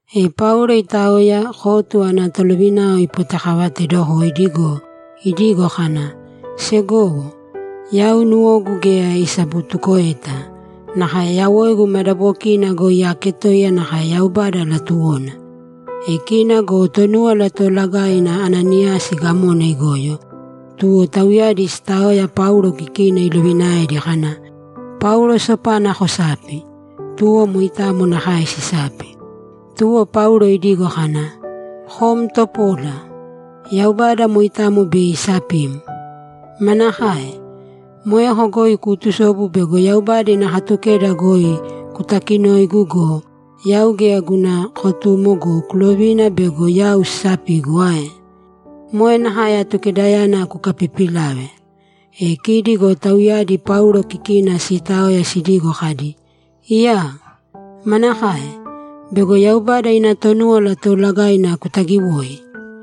E Paulo itaoya, kotu ana tolovinao ipotekavateedokoidi go, idigo kana, ‘Segowo, yau nuwogu geya isabutukoeta; nakae yawoigu madabokiina goi aaketoiya nakae Yaubada latuwona.’ E kina go Tonúwala Toolagaina Ananiyasi gamona igoyo, tuwo tauyadi siitaoya Paulo kikina ilovinaedi kana, ‘Paulo sopana kosāpi.’ Tuwo moitamo nakae sisapi. Tuwo Paulo idigo kana, ‘Kom topola! Yaubada moitamo bei isapim! Manakae? Moeko goi kuutusobu bego Yaubada ina Katukeda goi kutakinoigu go, yau geya guna kotumo go, kulovina bego yau sisapigu ae? Moe nakae Atukedayana kukapiipilave!’ E kidi go tauyadi Paulo kikina siitaoya sidigo kadi, ‘Iyaa! Manakae? Bego Yaubada ina Tonúwala Toolagaina kutagiwoi?’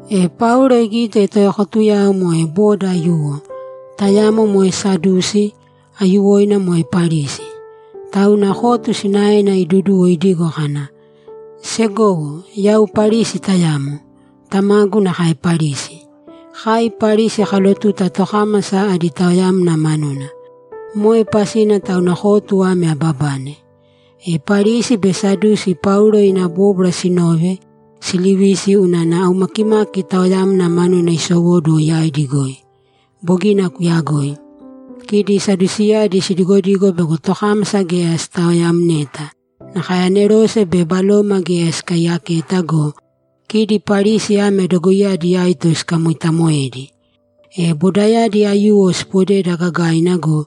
E Paulo igite toekotuyao moe boda aiyuwo, tayamo moe Sadusi, aiyuwoina moe Parisi. Tauna kotu sinaena iduduwo idigo kana, ‘Segowo, yau Parisi tayamo. Tamagu nakae Parisi. Kai Parisi kalotuta tokámasa adi taoyamna manuna. Moe pasina tauna kotu ame ababane.’ E Parisi be Sadusi Paulo ina bóbwara sinove, silivisi unana aumakimaki taoyamna manuna isowóduwo yaidi goi. Bogina kuyagoi. Kidi Sadusiyadi sidigodigo bego tokámasa geya sitaoyamneta, nakae anerose be baloma geya sikaiyaketa go, kidi Parisi ame dogoiyadi aito sikamoitamoedi. E bodayadi aiyuwo sipodeda gagaina go,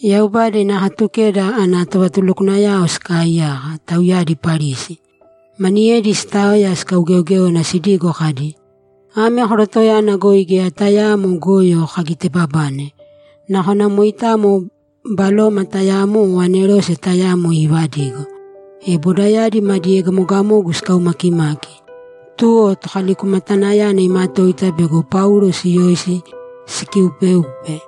Yaubada ina Katukeda ana tovatulukwanayao sikaaiyaka, tauyadi Parisi. Maniyedi sitaoya sikaugeogéona sidigo kadi, ‘Ame korotoyana goi geya tayaamo goyo kagitebabane. Nakona moitamo baloma tayamo o anerose tayamo iivadigo.’ E bodayadi madi egamogamogu sikaumakimaki, tuwo tokalikumatanayana imatoita bego Paulo siyoisi sikiupeupe.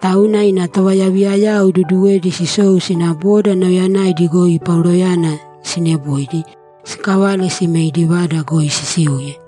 Tauna ina tovayaviyayao iduduwedi sisou sina boda nauyayanaidi goi Pauloyana sineboidi, sikavale sime idi vada goi sisiuye.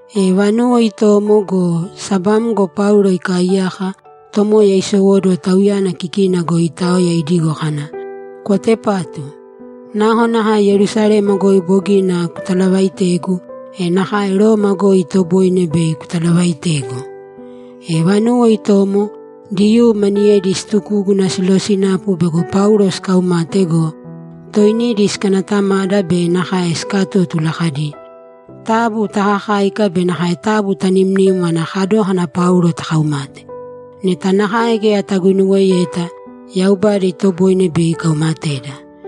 E vanuwo itomo go, sabamgo Paulo ikaaiyaka, Tomoya isowóduwo tauyana kikina goi iitaoya idigo kana, ‘Kwatepātu! Nakonakae Yerusalema goi bogina kutalavaitegu, e nakae Roma goi itoboine bei kutalavaitegu!’ E vanuwo itomo, Diyuu maniyedi situgúguna silosinapu bego Paulo sikaumate go, toinidi sikanatamada be nakae sikatótula kadi, ‘Taabu takakāika be nakae taabu tanimnīm ana kadókana Paulo takaumate. Neta nakae geya taguinuweyeta, Yaubada itoboine bei ikaumateda.’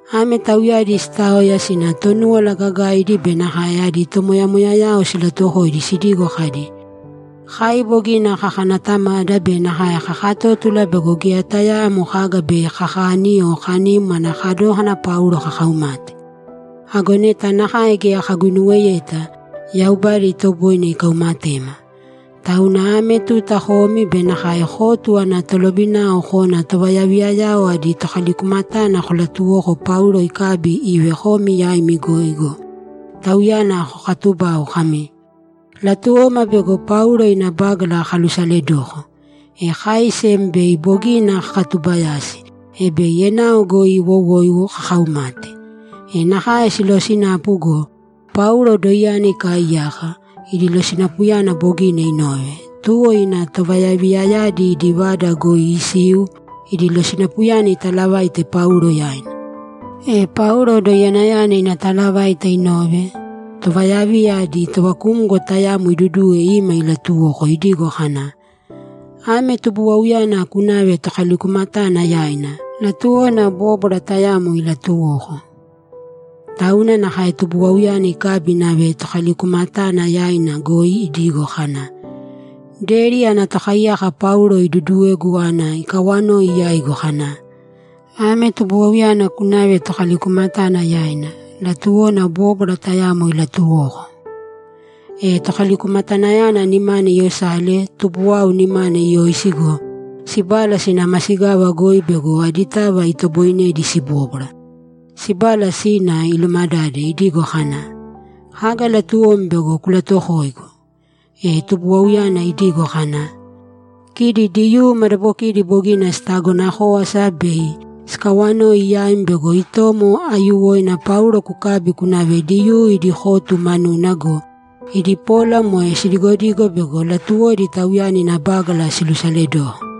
Ame tauyadi sitaoya sina Tonúwala Gagaidi be nakae adi tomoyamoyayao silatuwokoidi sidigo kadi, ‘Kai bogina kakanatamada be nakae kakatótula bego geya tayaamo kaga bei kakani o kanim ana kadókana Paulo kakaumate. Ago neta nakae geya kaguinuweyeta, Yaubada itoboine ikaumatema. Tauna ame tuta komi be nakae kotu ana tolovinao kōna tovayaviyayao adi tokalikumatana kolatuwōko Paulo ikabi ive komi yaimi goi go, tauyana kokatubau kami, “Latuwoma bego Paulo ina bágala kalusaledoko.” E kai sem bei bogina kakatubayasi, e bei enao goi iwowoiwo kakaumate.’ E nakae silosinapu go, Paulo doiyana ikaaiyaka, idi losinapuyana bogina inove, tuwo ina tovayaviyayadi idi vada goi isiu idi losinapuyana italavaite Paulo yaina. E Paulo doiyanayana ina talavaita inove, tovayaviya adi tovakumgo tayamo iduduwe ima ilatuwoko idigo kana, ‘Ame tubuwauyana kunāve tokalikumatana yaina; latuwona bóbwara tayamo ilatuwoko.’ Tauna nakae tubuwauyana ikabi inave tokalikumatana yaina goi idigo kana, ‘Deri ana tokaiyaka Paulo iduduwegu ana ikawanoi yaigu kana, “Ame tubuwauyana kunāve tokalikumatana yaina; latuwona bóbwara tayamo ilatuwoko.”’ E tokalikumatanayana nimana iyosale tubuwau nimana iyoisi go, sibala sina masigava goi bego aditava itoboinedi sibóbwara. Sibala sina, ilumadade idigo kana, ‘Kaga latuwom bego kulatuwokoigu?’ E tubuwauyana idigo kana, ‘Kidi Diyuu madabokidi bogina sitagona kówasa bei sikawanoi yaim bego itomo aiyuwoina Paulo kukabi kunave Diyuu idi kotu manuna go, idi pola moe sidigodigo bego latuwodi tauyana ina bágala silusaledoko.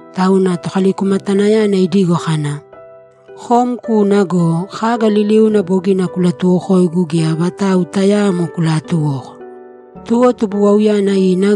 Tauna tokalikumatanayana idigo kana, ‘Kom kūna go, kaga liliuna bogina kulatuwokoigu geya vatau tayaamo kulaatuwōko.’ Tuwo tubuwauyana ina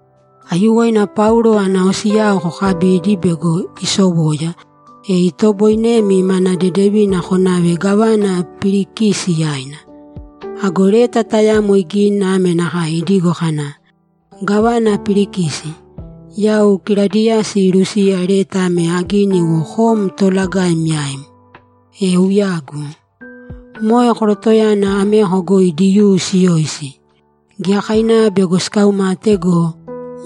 Aiyuwoina Paulo ana osiyao kokabīdi bego isowoya, e itoboinemi mana dedevina konave gávana Pilikisi yaina.’ Ago leta tayamo igini ame nakae idigo kana, ‘Gávana Pilikisi, Yau Kiladiyasi Lusiya leta ame agini iwo kom toolagaim yaim. E uyagu. Moe korotoyana ameko goi Diyuu siyoisi. Giyakainava bego sikaumate go,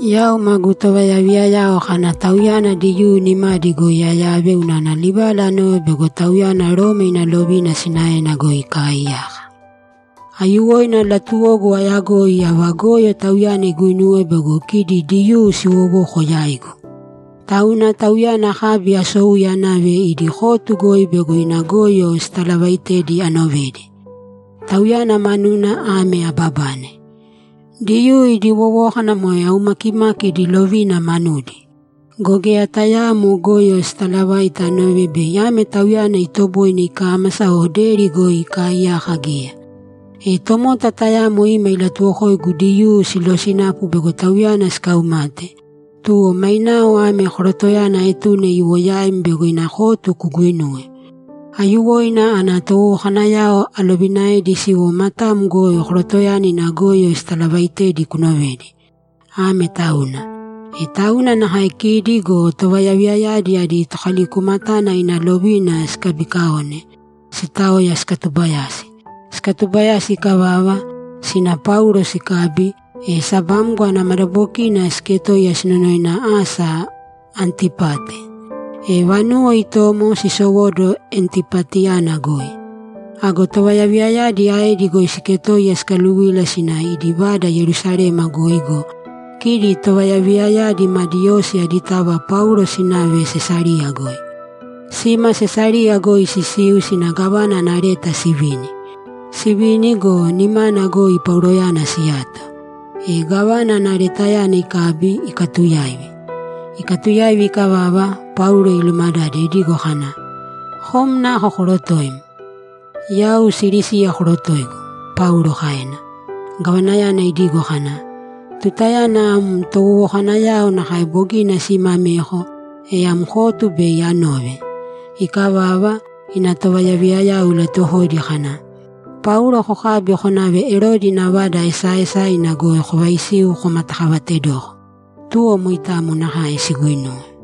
yau magu tovayaviyayao kana tauyana Diyuu nimadi goi ayave unana livala anove bego tauyana Roma ina lovina sinaena goi ikaaiyaka. Aiyuwoina latuwogu ayagoi ava goyo tauyana iguinuwe bego kidi Diyuu siwowoko yaigu. Tauna tauyana akabi asouye anave idi kotu goi bego ina goyo sitalavaitedi anovedi. Tauyana manuna ame ababane: Diyuu idi wowókana moe aumakimaki idi lovina manudi. Go geya tayaamo goyo sitalavaite anove bei ame tauyana itoboine ikámasa o deri goi ikaiyaka geya. E tomota tayamo ima ilatuwokoigu Diyuu silosinapu bego tauyana sikaumate, tuwo mainao ame korotoyana aetune iwo yaim bego ina kotu kuguinuwe. Aiyuwoina ana towowokanayao alovinaedi siwo matam goi korotoyana ina goyo sitalavaitedi kunovedi. Ame tauna.’ E tauna nakae kidi go tovayaviyayadi adi tokalikumatana ina lovina sikabikaone, sitaoya sikatubayasi. Sikatubayasi ikavava, sina Paulo sikabi, e sabamgo ana madabokina siketoiya sinonoina asa Antipate. E vanuwo itomo sisowóduwo Antipateyana goi. Ago tovayaviyayadi aedi goi siiketoiya sikaluvila sina idi vada Yerusalema goi go, kidi tovayaviyayadi madi osi aditava Paulo sinave Sesariya goi. Sima Sesariya goi sisiu sina gávana ana leta sivini. Sivini go, nimana goi Pauloyana siyato. E gávana ana letayana ikabi, ikatuyaivi. Ikatuyaivi ikavava, Paulo ilumadade idigo kana, ‘Kom nako korotoim?’ ‘Yau Silisiya korotoigu’, Paulo kaena. Gavanayana idigo kana, ‘Tutayana am towowokanayao nakae bogina sima ameko, e am kotu bei anove.’ Ikavava, ina tovayaviyayao ilatuwokoidi kana, ‘Paulo kokābi konāve Erodi ina vada esaaesaina goi kovaisīu komatakavatedoko.’ Tuwo moitamo nakae siguinuwe.